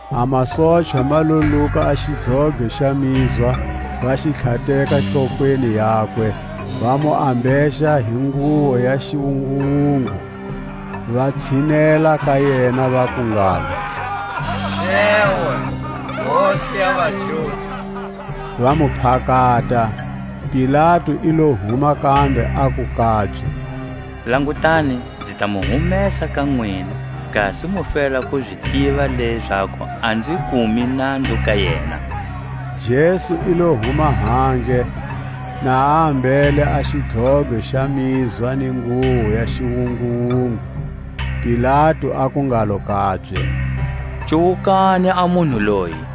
A masochwa ma lo luka a xidlodlo xa mizwa, va xi tlhateka hlokweni yakwe, va mu ambexa hi nguwo ya xiwunguwungu; va tshinela ka yena, vaku ngalo: Xewe, Hosi ya vaJuda! va mu phakata. Pilatu i lo huma kambe, aku kabye: Langutani, nzi ta mu humesa ka nwina, kasi mu fela ku zi tiva lezaku a nzi kumi nanzu ka yena. Jesu i lo huma handle, na a ambele a xidlodlo xa mizwa ni nguwo ya xiwunguwungu. Pilatu aku ngalo kabye: Cuwukani a munhu loyi!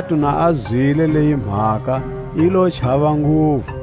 Pilatu na a zwile leyi mhaka, i lo chava nguvu;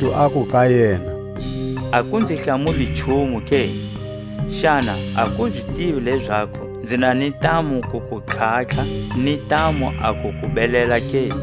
Pilatu aku ka yena: A ku nzi hlamuli nchumu ke? Xana a ku zi tivi lezaku nzi na ni ntamu ku ku tlhatlha, ni ntamu a ku ku belela ke?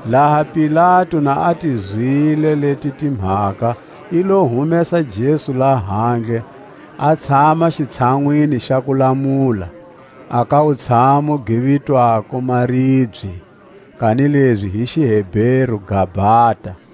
Laha Pilatu na a ti zwile leti timhaka, i lo humesa Jesu lahandle, a tshama xitshanwini xa kulamula, a ka wutshamu gi vitwako, Maribye, kanilezi hi xiHeberu, Gabata.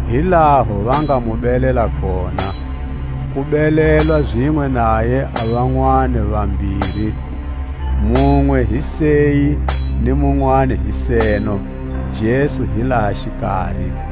Hi laho va nga mu belela kona; ku belelwa zinwe naye a vanwani va vambiri, munwe hi seyi ni munwani hi seno, Jesu hi laha xikari.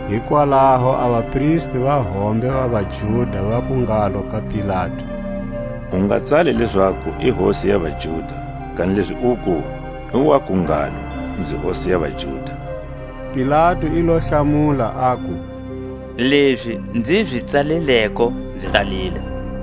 Hikwalaho a vapristi va hombe va vaJuda vaku ngalo ka Pilatu: U nga tsali lezaku, I Hosi ya vaJuda; kanilezi uku: I wa ku ngalo: Nzi Hosi ya vaJuda. Pilatu i lo hlamula, aku: Lezi nzi zi tsalileko, nzi tsalile.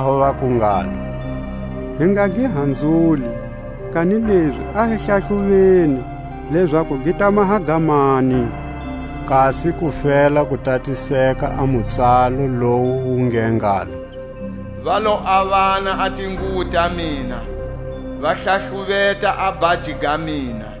Hikwalaho vaku ngalo: Hi nga gi hanzuli, kanilezi a hi hlahluveni, lezaku gi ta maha ga mani; kasi ku fela ku tatiseka a mutsalo, lowu wu nge ngalo: Va lo avana a tinguwo ta mina, Va hlahluveta a bhaji ga mina.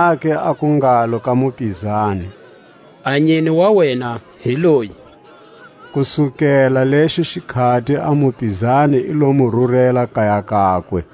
Zonake aku ngalo ka mupizani: A nyine wa wena hi loyi! Kusukela lexo xikhati a mupizani i lo mu rurela kaya kakwe.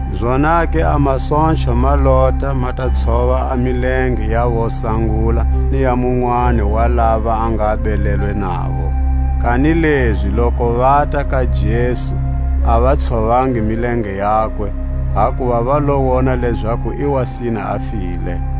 Zonake a masochwa ma lota, ma ta tshova a milenge ya wo sangula ni ya munwani wa lava a nga belelwe navo; kanilezi loku vata ka Jesu a va tshovangi milenge yakwe, hakuva va lo wona lezaku i wa sina a file.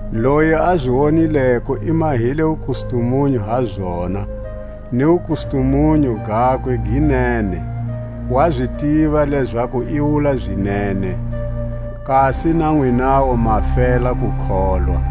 Loyi a zi wonileko i mahile wukustumunyu ha zona, ni wukustumunyu gakwe gi nene; wa zi tiva lezaku i wula zinene, kasi na nwinawu ma fela ku kholwa.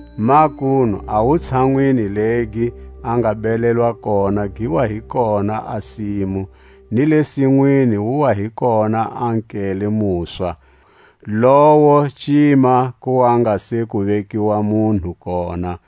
Makunu a wutshanwini legi a nga belelwa kona gi wa hi kona a simu, ni le sinwini wu wa hi kona a nkele muswa, lowo cima ku wa nga se ku vekiwa munhu kona.